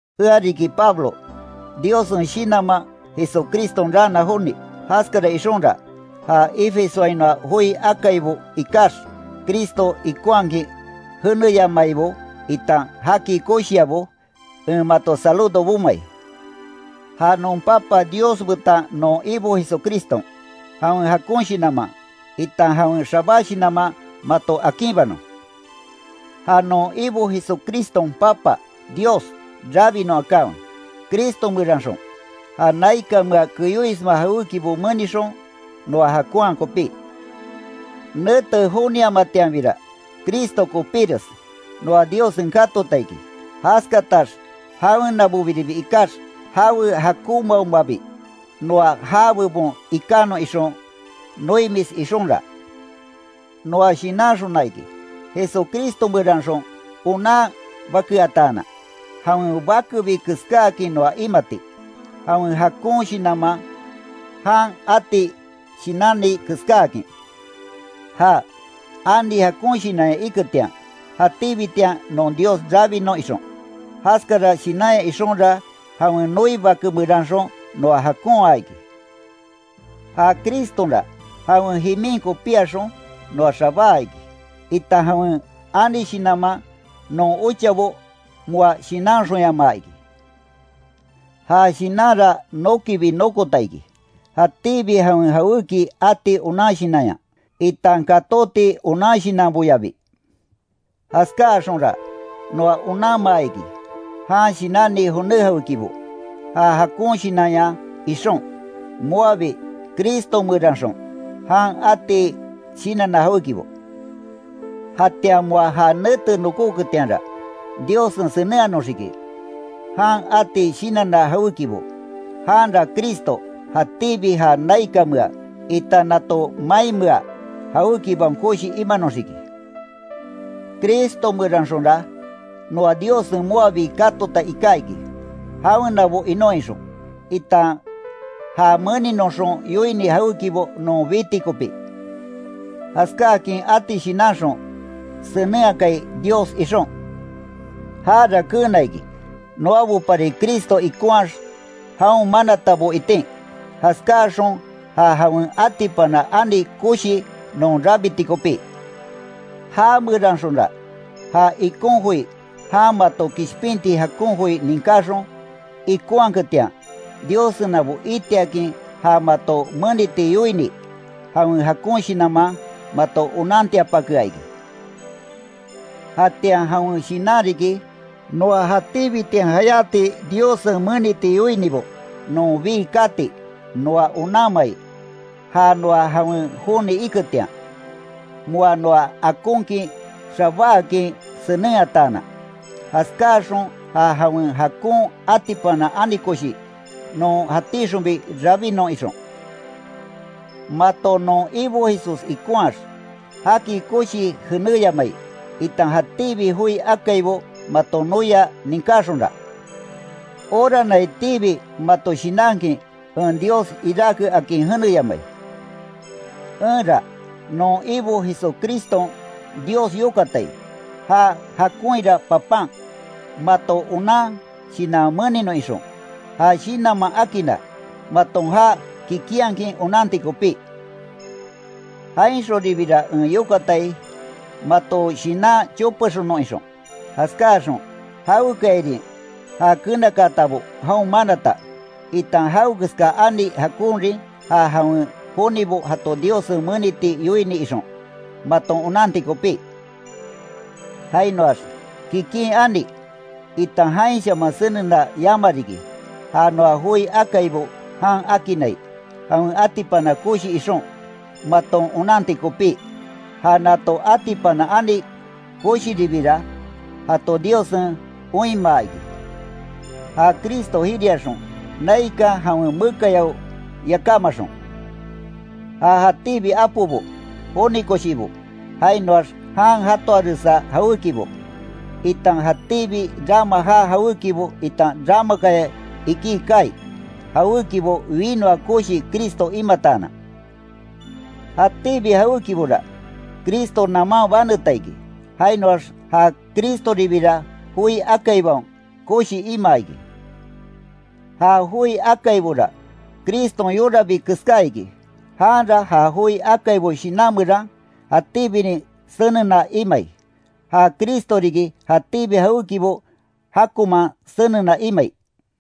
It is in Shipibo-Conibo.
Ea riki Pablo, Diossen shinanman Jesucriston raana joni. Jaskara ixonra, ja Efesoainoa joi akaibo ikax, Cristo ikonhakin jeneyamaibo itan jaki koshiabo, en mato saludo bomai. Ja non Papa Dios betan non Ibo Jesucriston, jawen jakon shinanman, itan jawen xabá shinanman mato akinbanon. Ja non Ibo Jesucriston Papa Dios rabinon akanwe, Cristo meranxon, ja naikanmea kéoisma jawékibo menixon, noa jakonhaa kopí. Nete joniamatianbira, Cristo kopíres, noa Diossen katota iki, jaskatax jawenabobiribi ikax, jawe jakonmaomabi, noa já bebon ikanon ixon. Noimis ixonra, noa shinanxona iki, Jesucristo meranxon onan bakeataanan, jawen bakebi keskáakin noa imati, jawen jakon shinanman jan ati shinanni keskáakin. Ja, ani jakon shinanya iketian, jatíbitian non Dios rabinon ixon, jaskara shinanya ixonra jawen noi Bake meranxon noa jakonha iki. Ja Cristonra, jawen jimin kopíaxon, noa xabáa iki, itan jawen ani shinanman non ochabo moa shinanxonyamaa iki, Ja shinanra nokibi nokota iki, jatíbi jawen jawéki ati onan shinanya, itan katóti onan shinanboyabi. Jaskáaxonra, noa onanmaa iki, jan shinanni joné jawékibo. Ja jakon shinanya ixon, moabi Cristo meranxon, jan ati shinanna jawékibo. Jatian moa ja nete nokoketianra, Diossen senenhanoxiki, jan ati shinanna jawékibo, janra Cristo, jatíbi ja naikanmea, itan nato mainmea jawékibaon koshi imanoxiki. Cristo meranxonra, noa Diossen moabi katota iká iki, jawenabo inon ixon, itan ja meninoxon yoini jawékibo non biti kopí. Jaskáakin ati shinanxon, senenhakai Dios ixon. Jara keena iki, noabopari Cristo ikonhaax, jaon manatabo itin, jaskáaxon ja jawen atipana ani koshi non rabiti kopí. Já meranxonra, ja ikon joi, jan mato kishpinti jakon joi ninkaxon, ikonhaketian, Diossenabo itiakin ja mato meniti yoini, jawen jakon Shinanman mato onantiapakea iki. Jatian jawen Shinan riki, noa jatíbitian jayáti Diossen meniti yoinibo non bii kati noa onanmai, ja noa jawen joni iketian, moa noa akonkin xabáakin senenhataanan. Jaskáaxon ja jawen jakon atipana ani koshi, non jatíxonbi rabinon ixon. Mato non Ibo Jesús ikonhaax, jaki koshii jeneyamai, itan jatíbi joi akaibo maton noia ninkaxonra, oranaitiibi mato shinankin, en Dios iráke akin, jeneyamai. Enra, non Ibo Jesucriston Dios yokatai, ja jakonhira Papan, mato onan shinan meninon ixon, ja shinanman akinna, maton já kikinhakin onanti kopí. Jainxonribira en yokatai, mato shinan chopexonnon ixon, jaskáaxon, jawekayarin ja keenakatabo jaon manata, itan jawekeska ani jakonrin ja jawen jonibo jato Diossen meniti yoini ixon, maton onanti kopí, jainoax, kikin ani, itan jainshaman senena yama riki, ja noa joi akaibo jan akinnai, jawen atipana koshi ixon, maton onanti kopí. Ja nato atipana ani koshiribira, jato Diossen oinmaa iki, ja Cristo jiriaxon, naikan jawen mekayao yakámaxon. Ja jatíbi apobo, joni koshibo, jainoax jan jatoaresa jawékibo, itan jatíbi rama jaa jawékibo itan ramakaya iki kaai, jawékibo winoa koshi Cristo imataanan. Jatíbi jawékibora, Cristo naman baneta iki, jainoax ja Cristoribira joi akaibaon, koshi imaa iki. Ja joi akaibora, Criston yorabi keská iki, janra ja joi akaibo shinan meran, jatíbinin senena imai, ja Cristo riki, jatíbi jawékibo jakonman senena imai.